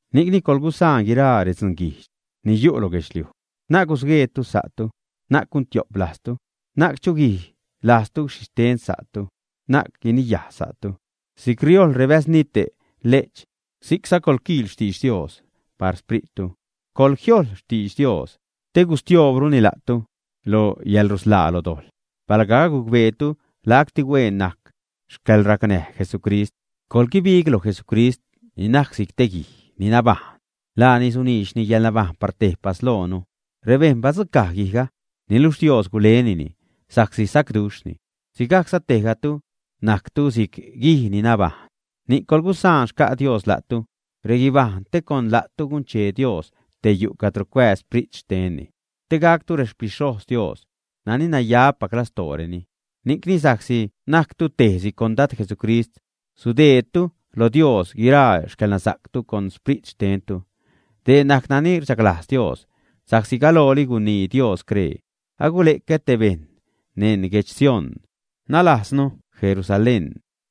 Ni'cni coḻgusaan guiraa redzunguijdx ni yu' lo guedxliuj, na'c gusgueetu sa'tu, na'c guntiop lajztu, na'c chuguij lajztu xhixten sa'tu, na'c guiniyaj sa'tu. Si'c riojl rebäznite' le'ch, si'cza coḻquiil xtidx Dios par sprittu. Coḻjiojḻ xtidx Dios te gustioobruni la'tu lo yäḻrusḻaa lo dojḻ, palga agucbeetu lacti hueen najc xcäḻracnäj Jesucrist. Coḻguibig loj Jesucrist ni najc si'c te guij ni nabajṉ. Laani suniidx yäḻnabajṉ par tejpas loonu. Rebejṉ badzucaj guijga, niluxh Dios gulenini sa'csi sacduxhni. Sigajcza tejgatu najctu si'c guij ni nabajṉ, ni'c coḻgusaan xca' Dios la'tu, reguibajṉ, te con la'tu gunchee Dios te yu' cadro cuääz Sprit xtenni, te gactu rexpixhojz Dios, nani nayapac lastooreni. Ni'cni sa'csi najctu tejtis con Dad Jesucrist sudeedtu lo Dios guiraa xcäḻnasa'ctu con xprit xtentu. Dee najc nani rchaglajz Dios. Sa'csi galooli gunii Dios scree: Agule'cä te bejṉ neṉ guedx Sión, nalajznu Jerusalén,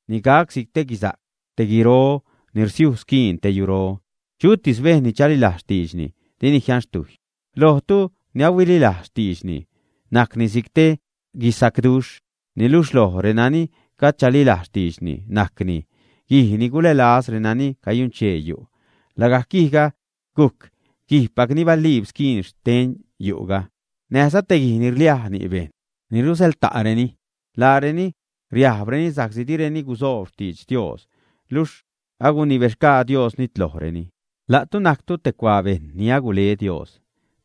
ni gac si'c te guisa'c, te guiro ni rsiuj squiin te yuro. Chutis bejṉ ni chalilajz xtiidxni, dini jianxtujy. Lojtu ni ahuililajz xtiidxni najcni si'c te guisacduxh, niluxh loj renani gajd chalilajz xtiidxni, najcni: Guij ni gulälaz renani cayunchee yu', lagajc guijga gujc guijpac ni baliib squiin xten yu'ga näjza: Te guij ni rliaj ni' bejṉ, ni ruzäḻta'reni, laareni riajbreni sa'csi direni gusoob xtidx Dios, luxh agunibexgaa Dios nitlojreni. La'tu najctu te cuaa bejṉ ni agule Dios,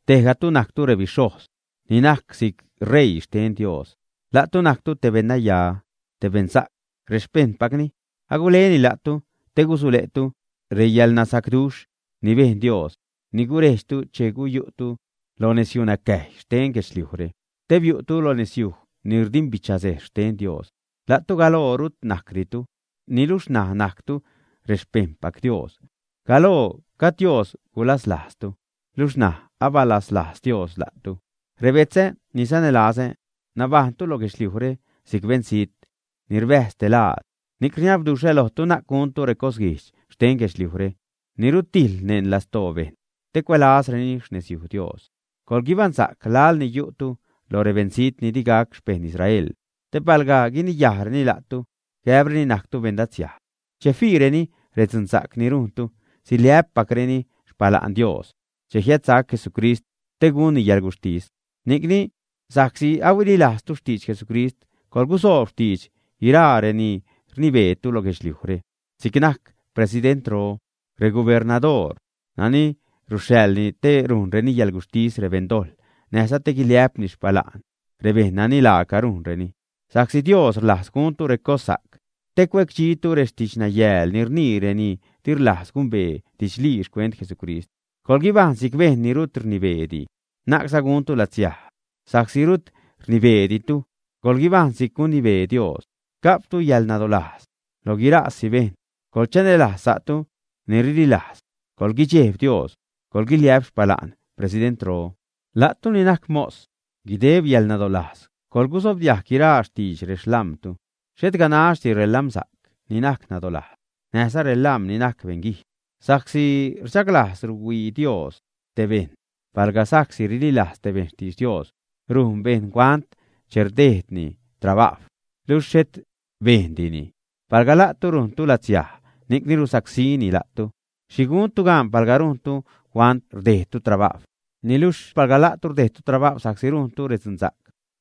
tejgatu najctu rebixhojz ni najc si'c ṟeii xten Dios. La'tu najctu te beṉnaya, te beṉsa'c, rexpejṉpacni. Aguleni la'tu te gusule'tu reyäḻnasacduxh ni bejn Dios ni gurejdxtu che guyu'tu lo nezyunacäjy xten guedxliujre te biu'tu lo nezyuj ni rdimbichasejz xten Dios. La'tu galoo rut najcditu, niluxh ṉaj najctu rexpejṉpac Dios. Galoo gajd Dios gulaslajztu, luxh ṉaj abalaslajz Dios la'tu. Rebetzä ni sanälazä, nabajṉtu lo guedxliujre si'c beṉzijt, ni rbäjz te laad, ni'c rniabduxhä lojtu, na'c guntu recosguijdx xten guedxliujre, ni rutijḻ neṉ lastoo bejṉ te cuälazreni xnezyuj Dios. Coḻguibaṉsa'c laḻ ni yu'tu loj rebeṉzijt ni di gac xpejṉ Israel te palga guiniyajreni la'tu gäbreni najctu beṉlatsiaj, che fiireni redzunsa'c ni rujntu, siliä'ppacreni xpala'n Dios che jiädsac Jesucrist te gunni yäḻguxhtis. Ni'cni, sa'csi huililajztu xtidx Jesucrist, coḻgusoob xtidx guiraa reni rnibeetu lo guedxliujre, si'c najc presidentro, regubernadoor nani ruxhaḻni te rujnreni yäḻguxhtis rebeṉdojḻ näjza te guiliä'pni xpala'n rebeṉ nani laaca rujnreni. Sa'csi Dios rlajz guntu recossa'c te cuecdxitu rextidxnayääl ni rnii reni di rlajz gumbee didxlii xcuent Jesucrist. Coḻguibajṉ si'c bejṉ ni rut rnibeedi, na'cza guntu latsiaj sa'csi rut rnibeeditu, coḻguibajṉ si'c guinibee Dios. Ga'ptu yäḻnadolajz loj guiraasi bejṉ. Coḻchanälajz sa'tu ni rililajz. Coḻguidxejb Dios, coḻguiliä'p xpala'n presidentro. La'tu ni najc mos, guideb yäḻnadolajz coḻgusobdiajg guiraa xtidx rexlam̲tu, xhet ganaxdi relam̲sa'c ni najc nadolajz, näjza relam̲ ni najc beṉguijdx. Sa'csi rchaglajz ruhuii Dios te bejṉ palga sa'csi rililajz te bejṉ xtidx Dios rujn bejṉ huant che rdejdni trabajw luxh xhet bejndini. Palga la'tu rujntu latsiaj ni'cni rusacsíni la'tu, ¿xhi guntu gaan palga rujntu huant rdejdtu trabajw? Niluxh palga la'tu rdejdtu trabajw sa'csi rujntu redzunsa'c,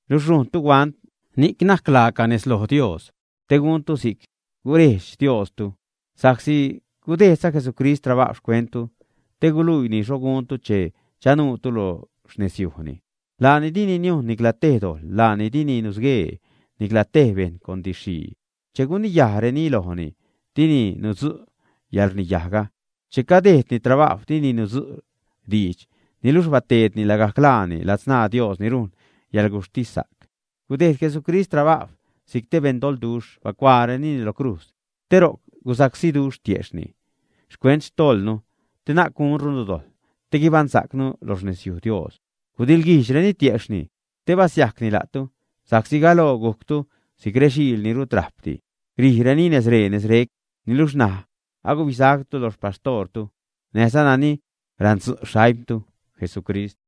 luxh rujntu huant, ni'c najc laaca nez loj Dios. Te guntu si'c gurejdx Diostu, sa'csi gudejdza Jesucrist trabajw xcuenttu te guluiini xho guntu che chanuutu lo xnezyujni. Laani dini niujn nicla tej dojḻ, laani dini nusguee nicla tej bejṉ con didx-xhii. Che guniyajreni lojni, dini nudzu' yäḻrniyajga. Che cadejdni trabajw, dini nudzu' diidx niluxh bateedni lagajc laani ladzṉaa Dios ni rujn yäḻguxhtissa'c. Gudeed Jesucrist trabajw si'c te beṉdoḻduxh, bacuaarenini lo crujz te ro'c gusacsíduxh tiejxhni xcuent xtojḻnu, te na'c gunrunu dojḻ, te guibaṉsa'cnu lo xnezyuj Dios. Gudiḻguijdxreni tiejxhni te basiajcni la'tu. Sa'csi galoo gujctu si'c rexiil ni rut rajpdi, rijreni nezree-nezrec. Niluxh ṉaj agubisactu lo xpaxtoortu näjza nani randzu' xaimtu, Jesucrist.